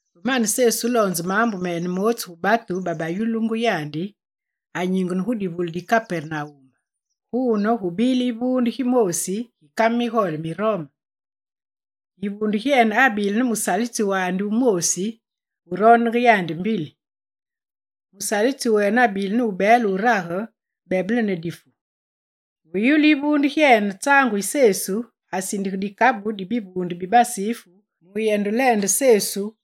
Ve mane Sesu wuloonze maambu mene mootsu gu batu babayululungu yandi, anyingene gu divule di Kapernawum. Guune, gubile yivuunde gimoosi gi kame migole mi Rome. Yivuunde gyene abile ne musalitsi wandi wumoosi wuroondenge yandi mbili. Musalitsi wene abile ne wubeele wurage, bebele ne difu. Ve yulu yivuunde gyene tsaangu yi Sesu, asindige dikabu di bivuunde bibasifu mu yendeleende Sesu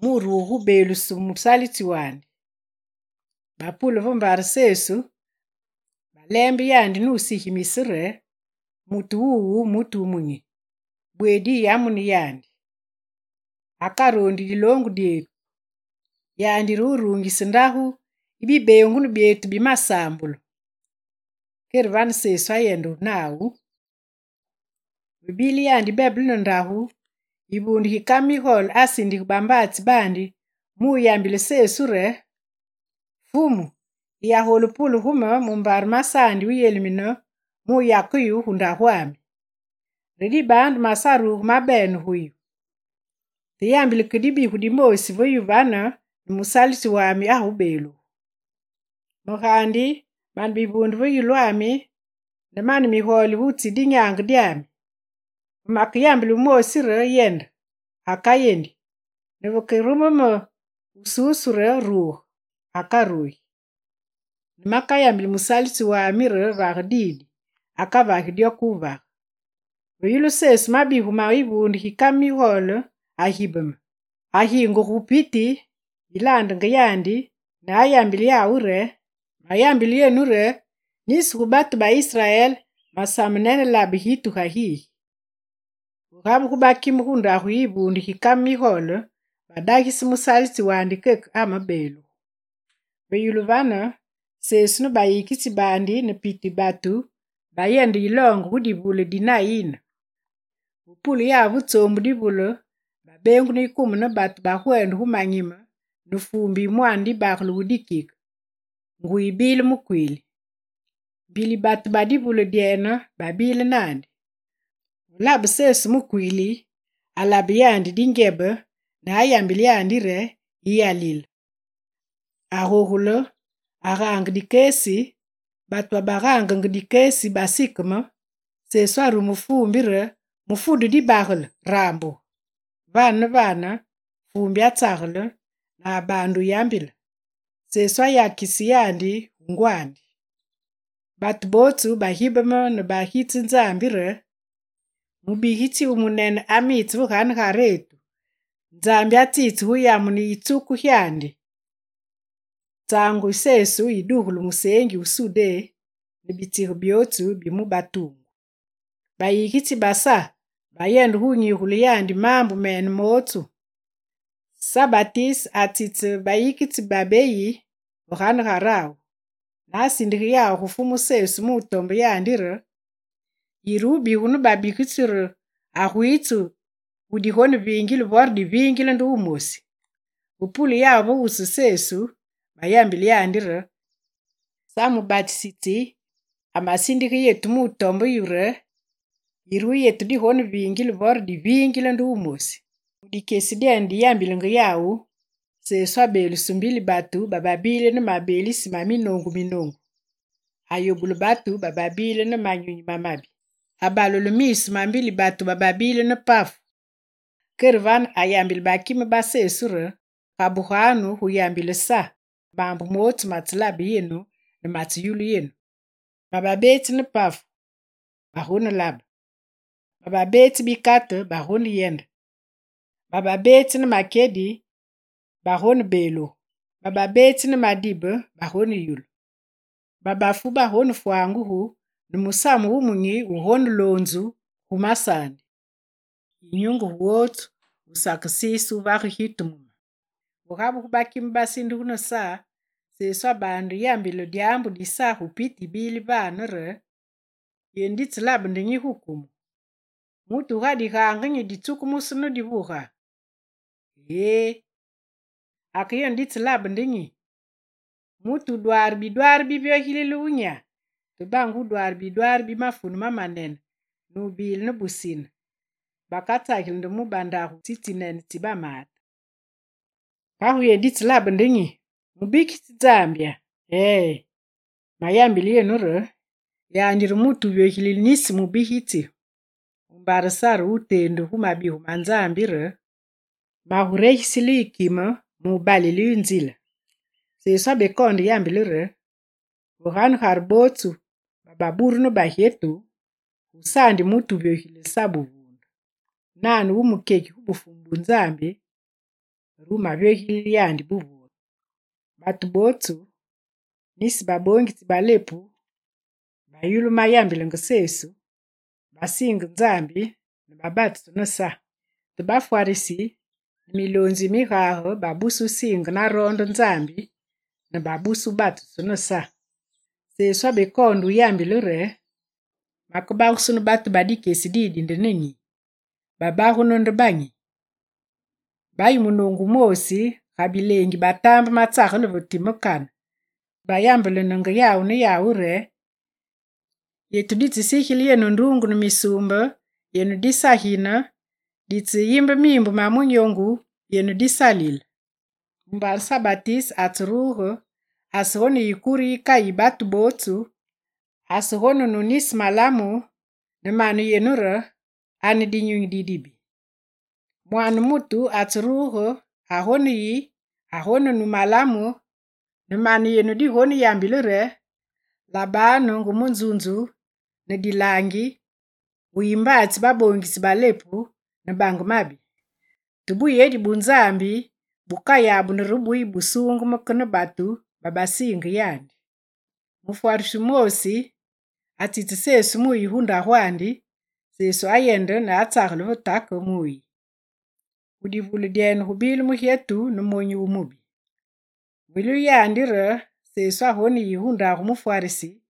muruge gubeeluse musalitsi wandi. Bapule ve mbare Sesu, baleembe yandi nusigimise re: «Mutu wuwu, mutu wumunyi, bweedi yiyamuni yandi. Akaroondi diloongu dyetu. Yandi re wuruungise ndagu yi bibeengunu byetu bimasaambulu.» Kere vane Sesu ayende nawu. Ve bile yandi bebele ne ndagu, yivuunde gi kame migole asindige bambaatsi baandi mu yambile Sesu re: «Fumu, yiyagolu wupule gu me, mumbare masaandi wuyelimine muyake yu gu ndagwami. Re dibaandu, masaruge mabene gu yu. Te yambile ke dibigu dimoosi ve yu vane ne musalitsi wami agubeelugu. Me gaandi mane bivuunde ve yulwami, ne mane migole gutsi dinyaange dyami. Ve makeyambile wumoosi re: “Yende!”, akayendi, ne vekerume me wususu re: “Ruge!”, akarugi. Ne makayambili musalitsi wami re: “Vage didi!”, akavagi dyo ke wuvage.» Ve yulu Sesu mabigu ma yivuunde gi kame migole, agibeme. Agingugu gu piti yilaandenge yandi ne ayambile yawu re: «Mayambile yenu re nisi gu batu ba Israel, masame nene labe gitu ga gigi.» Ve gabugu bakime gu ndagu yi yivuunde gi kame migole, badagise musalitsi wandi keke amabeelugu. Ve yulu vane, Sesu ne bayikitsi baandi ne piti batu bayende yiloonge gu divule di Nayine. Ve pule yawu ve tsoombu divule babeengunu yikume ne batu bagwende gu manyime ne fuumbi yi mwaane dibagale wu dikike, nguyi bile mukwiili. Mbili batu ba divule dyene babile naandi. Ve labe Sesu mukwiili, alabe yandi ngyebe ne ayambile yandi re: «Yiyalile!» Agogule, agaange dikesi, batu babagaangenge dikesi basikeme, Sesu arume fuumbi re: «Mufudu dibagale, rambuge!» Vane ne vane: Fuumbi atsagele ne abaande yambile, Sesu ayakise yandi gu ngwandi. Batu bootsu bagibeme ne bagitse Nzambi re: «Mubigitsi wu munene amitse ve ganegaretu, Nzambi atsitse gu yamune yitsuku gyandi.» Tsangu Sesu yi dugulu musengi wu Sudé ne bitsige byotsu bi mu batungu. Bayikitsi ba Sa bayende gu wunyigule yandi maambu mene mootsu. Sa Batise atsitse bayikitsi babeyi ve ganegarawu. Ne asindige yawu gu Fumu Sesu mutombe yandi re: «Yire wubigu ne babigitsi re agwitse, wudigoneviingile, vore dibeviingile nde wumosi?» Ve pule yawu ve wusu Sesu, bayambile yandi re: «Sa mubatisi amasindige yetu mutombe yu re: “Yire wu yetu digoneviingile, vore dibeviingile nde wumosi?”» Mu dikyesi dyene diyambilenge yawu, Sesu abeeluse mbili batu bababile ne mabeelise ma minoongu minoongu. Ayobule batu bababile ne manyunyi mamabi. Abalule miisu ma mbili batu bababile ne pafu. Kere vane, ayagule bakime ba Sa re: «Gabuganu gu yambile Sa maambu mootsu matselabe yenu, ne matseyulu yenu: bababetsi ne pafu bagonelabe, bababetsi bikate bagoneyende, bababetsi ne makyedi bagonebeelugu, bababetsi ne madibe bagoneyulu, babafu bagonefwangugu, ne Musamu Wumunyi wugoneloonzu gu masaandi. Yinyunge gu wotsu wusakesiise wuvage gitu mu me.» Ve gabugu bakime basindugu ne Sa, Sesu abaande yambile dyaambu di Sa gu piti yibile vane re: «Yenu ditseyelabe nde nyi gu kumu? Mutu wu ga digangeyi ditsukumusu ne divuga? Eée! Ake yenu ditseyelabe nde nyi? Mutu wu dwaare bidwaari bivyogilile wunyya? Te bange wudwaare bidwaari bi mafunu mamanene, nubile ne busine, bakatsageli nde mu bandagu tsitsinene, tsi bamaate. Kagu yenu ditseyelabe nde nyi? Mubigitsi Nzambya? Ee, mayambile yenu re: yandi re mutu wuvyogilile nisi mubigitsi. Mumbare Sa re wuteendu gu mabigu ma Nzambi re: “Maguregisile kimami mubalile yu nzile.”» Sesu abekoonde yambile re: «Ve ganegare bootsu bababuru ne bagyetu, gusaandi mutu wuvyogilile Sa buvuunde. Nane wumukyeki gu Bufumu bu Nzambi, re wumavyogilile yandi buvuunde.» Batu bootsu, nisi baboongitsi ba lepu, babayulu mayambilenge Sesu, basiinge Nzambi ne babatusu ne Sa. Te bafwarisi ne miloonzi mi migage babuse wusiinge naroonde Nzambi ne babuse wubatusu ne Sa. Sesu abekoonde yambile re: «Makebagusunu batu ba dikyesi didi nde ne nyi? Babagunu nde banyi? Bayi munoongu wumoosi ga bileengi batambe matsagele ve time kane ne bayambelenenge yawu ne yawu re: “Yetu ditsesigile yenu nduungu ne misuumbe, yenu disagine, ditseyimbe miimbu ma munyoongu yenu disalile.” Mumbare Sa Batise atseruge, asegoneyi kure yikayi batu bootsu ne asegonenu nisi malamu, ne mane yenu re: “Ane dinyunyi didibi.” Mwaane mutu atseruge agoneyi, agonenu malamu ne mane yenu digoneyambile re: “Labanu nge munzunzu ne dilaangi, wuyi mbaatsi baboongitsi ba lepu, ne bange mabi.” Te buyedi bu Nzambi bukayabunu re buyibusuungeme ke ne batu babasiinge yandi.» Mufwarisi wumoosi atsitse Sesu muyi gu ndagwandi, Sesu ayende ne atsagele ve take mu wuyi. Gu divule dyene gubile mugyetu ne monyu wu mubi. Ve yulu yandi re Sesu agoneyi gu ndagu mufwarisi,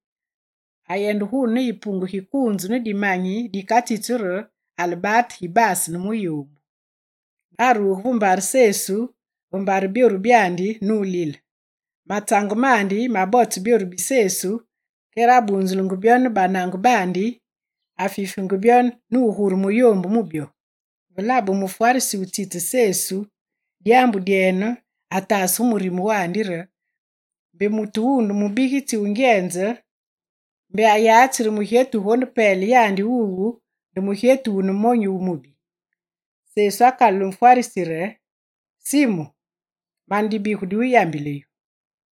ayende guune ne yipunge gikuunzu ne dimanyi dikatsitsu re albate, gibaase ne miyoombu. Ne aruge ve nzime Sesu ve mbare byoru byandi nulile. Matsange mandi mabotse byoru bi Sesu, kere abunzulenge byo ne banange baandi, afifenge byo ne wugure miyoombu mu byo. Ve labe mufwarisi wutsitse Sesu dyaambu dyene, ataase gu murime wandi re mbe mutu wuwu nde mubigitsi wugyenze, mbe ayatsi re mugyetu wugonepele yandi wuwu nde mugyetu wune monyu wu mubi. Sesu akalule mufwarisi re: «Simu, mane dibigu diwuyambile yu.»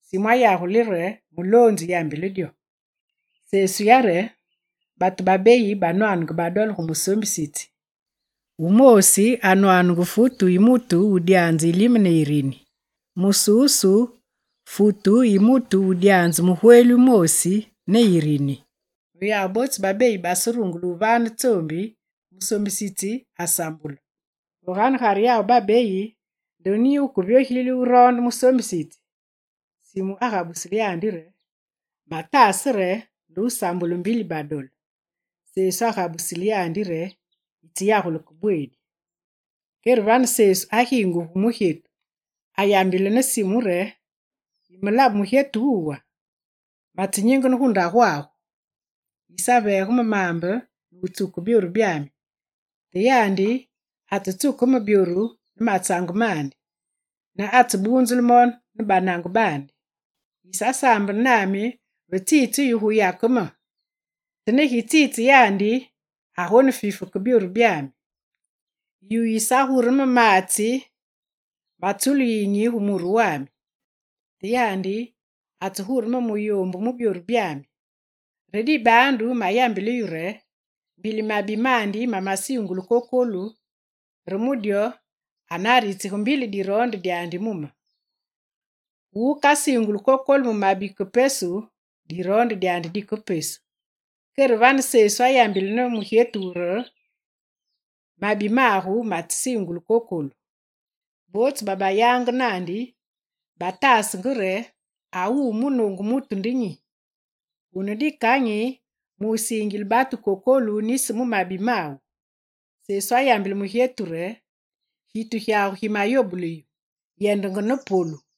Simu ayagule re: «Muloonzi yambile dyo.» Sesu yare: «Batu babeyi banwanenge badole gu musoombisitsi. Wumoosi anwanenge futu yi mutu wudyaanze yilime ne yirini, mususu futu yi mutu wudyaanze mugweli wumoosi ne yirini. Ve yawu bootsu babeyi baserungule wuvane tsoombi, musoombisitsi asambule. Ve ganegare yawu babeyi nde nyi wukevyogilile wuroonde musoombisitsi?» Simu agabusile Sesu re: «Mataase re nde wusambululu mbili badole.» Sesu agabusile yandi re: «Yitseyagule ke bweedi!» Kere vane Sesu agingugu gu mugyetu, ne ayambile ne Simu re: «Yimelabe mugyetu wuwa? Matsenyingene gu ndagwagu, yisaveege me maambe ne wutsuke byoru byami, te yandi atsetsuke me byoru ne matsange mandi, ne atsebunzule mo ne banange baandi. Yisasaambene nami ve tsitse yu guyake me, te ne gitsenyingene yandi, agonefife ke byoru byami. Yu yisagure maatsi matsulu yiyinyi gu yulu muru wami, te yandi atsegure me miyoombu mu byoru byami. Re dibaandu mayambile yu re: mbili mabi mandi mamasiingulu kokolu, re mu dyo, anaritsige mbili diroonde dyandi mu me. Gu wukasiingulu kokolu mu mabi ke pesu, diroonde dyandi dike pesu.» Kere vane Sesu ayambile ne mugyetu re: «Mabi magu matsesiingulu kokolu.» Bootsu babayange naandi, batasenge mu mirime re: «A wuwu munoongu mutu nde nyi? Wune dikanyi musiingile batu kokolu nisi mu mabi mawu?» Sesu ayambile mugyetu re: «Gitu gyagu gimayobule yu, yendenge ne polu.»